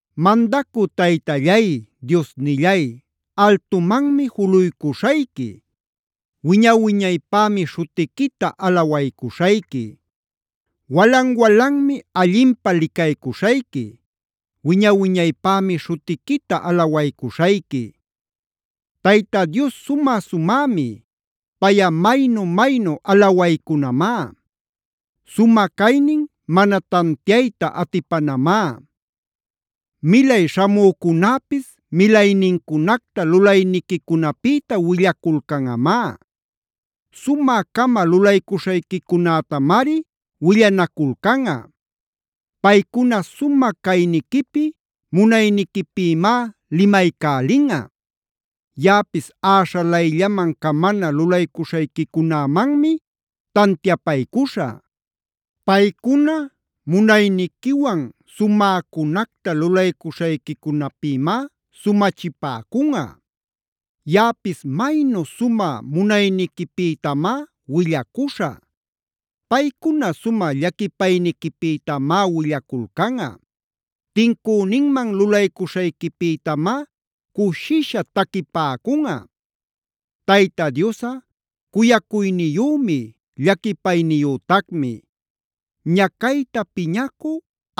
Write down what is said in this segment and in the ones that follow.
Mandacü Taytallay, Diosnillay, altumanmi juluycuśhayqui. Wiña-wiñaypämi śhutiquita alawaycuśhayqui. Walan-walanmi allinpä licaycuśhayqui. Wiña-wiñaypämi śhutiquita alawaycuśhayqui. Tayta Dios sumä-sumämi. Payꞌa maynu-maynu alawaycunamá. Sumä caynin mana tantiayta atipanamá. Milay śhamücunäpis milaynincunacta lulayniquicunapïta willaculcanꞌamá. Sumä-cama lulaycuśhayquicunätamari willanaculcanꞌa. Paycuna sumä cayniquipi, munayniquipïmá limaycälinꞌa. Yaꞌapis äśhalayllaman camana lulaycuśhayquicunämanmi tantiapaycuśhä. Paycuna munayniquiwan sumäcunacta lulaycuśhayquicunapïmá sumachipäcunꞌa. Yaꞌapis maynu sumä munayniquipïtamá willacuśhä. Paycuna sumä llaquipayniquipïtamá willaculcanꞌa. Tincüninman lulaycuśhayquipïtamá cushisha taquipäcunꞌa. Tayta Diosꞌa, cuyacuyniyümi, llaquipayniyütacmi. Ñacayta piñacü,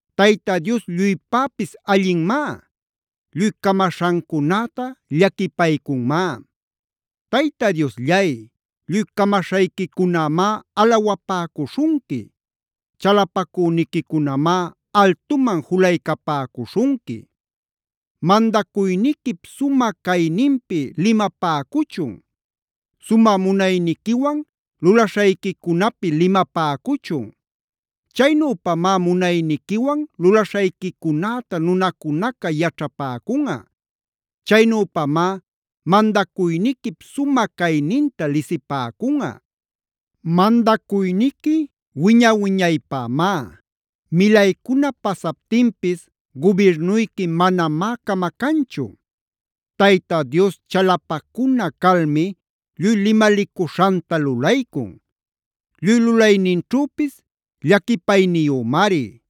Tayta Dios lluypäpis allinmá. Lluy camaśhancunäta llaquipaycunmá. Tayta Diosllay, lluy camaśhayquicunämá alawapäcuśhunqui. Chalapacüniquicunamá altuman julaycapäcuśhunqui. Mandacuyniquip sumä cayninpi limapäcuchun. Sumä munayniquiwan lulaśhayquicunapi limapäcuchun. Chaynüpamá munayniquiwan lulaśhayquicunäta nunacunaca yaćhapäcunꞌa. Chaynüpamá mandacuyniquip sumä cayninta lisipäcunꞌa. Mandacuyniqui wiña-wiñaypämá. Milaycuna pasaptinpis gubirnuyqui manamá camacanchu. Tayta Dios chalapacuna calmi lluy limalicuśhanta lulaycun. Lluy lulayninćhüpis llaquipayniyümari.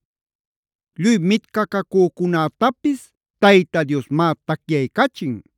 Lluy mitcacücunätapis Tayta Diosmá tacyaycachin.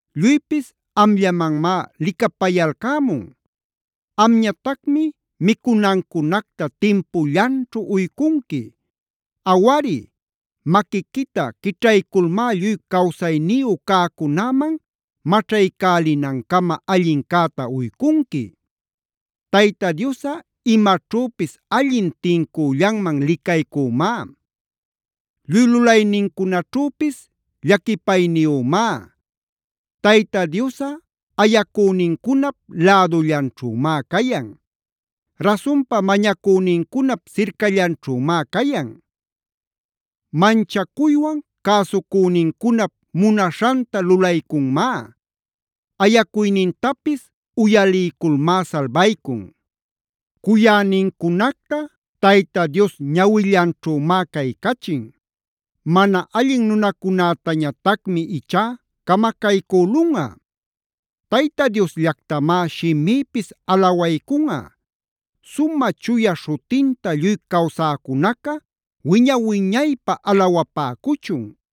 Lluypis amllamanmá licapayalcämun. Amñatacmi micunancunacta timpullanćhu uycunqui. Awari, maquiquita quićhayculmá lluy cawsayniyu cäcunäman maćhaycälinancama allincäta uycunqui. Tayta Diosꞌa imaćhüpis allin tincüllanman licaycümá. Lluy lulaynincunaćhüpis llaquipayniyümá. Tayta Diosꞌa ayacünincunap lädullanćhümá cayan. Rasunpa mañacünincunap sircallanćhümá cayan. Manchacuywan cäsucünincunap munaśhanta lulaycunmá. Ayacuynintapis uyaliyculmá salbaycun. Cuyänincunacta Tayta Dios ñawillanćhümá caycachin. Mana allin nunacunätañatacmi ichá camacaycülunꞌa. Tayta Diosllactamá shimïpis alawaycunꞌa. Sumä chuya śhutinta lluy cawsäcunaca wiña-wiñaypä alawapäcuchun.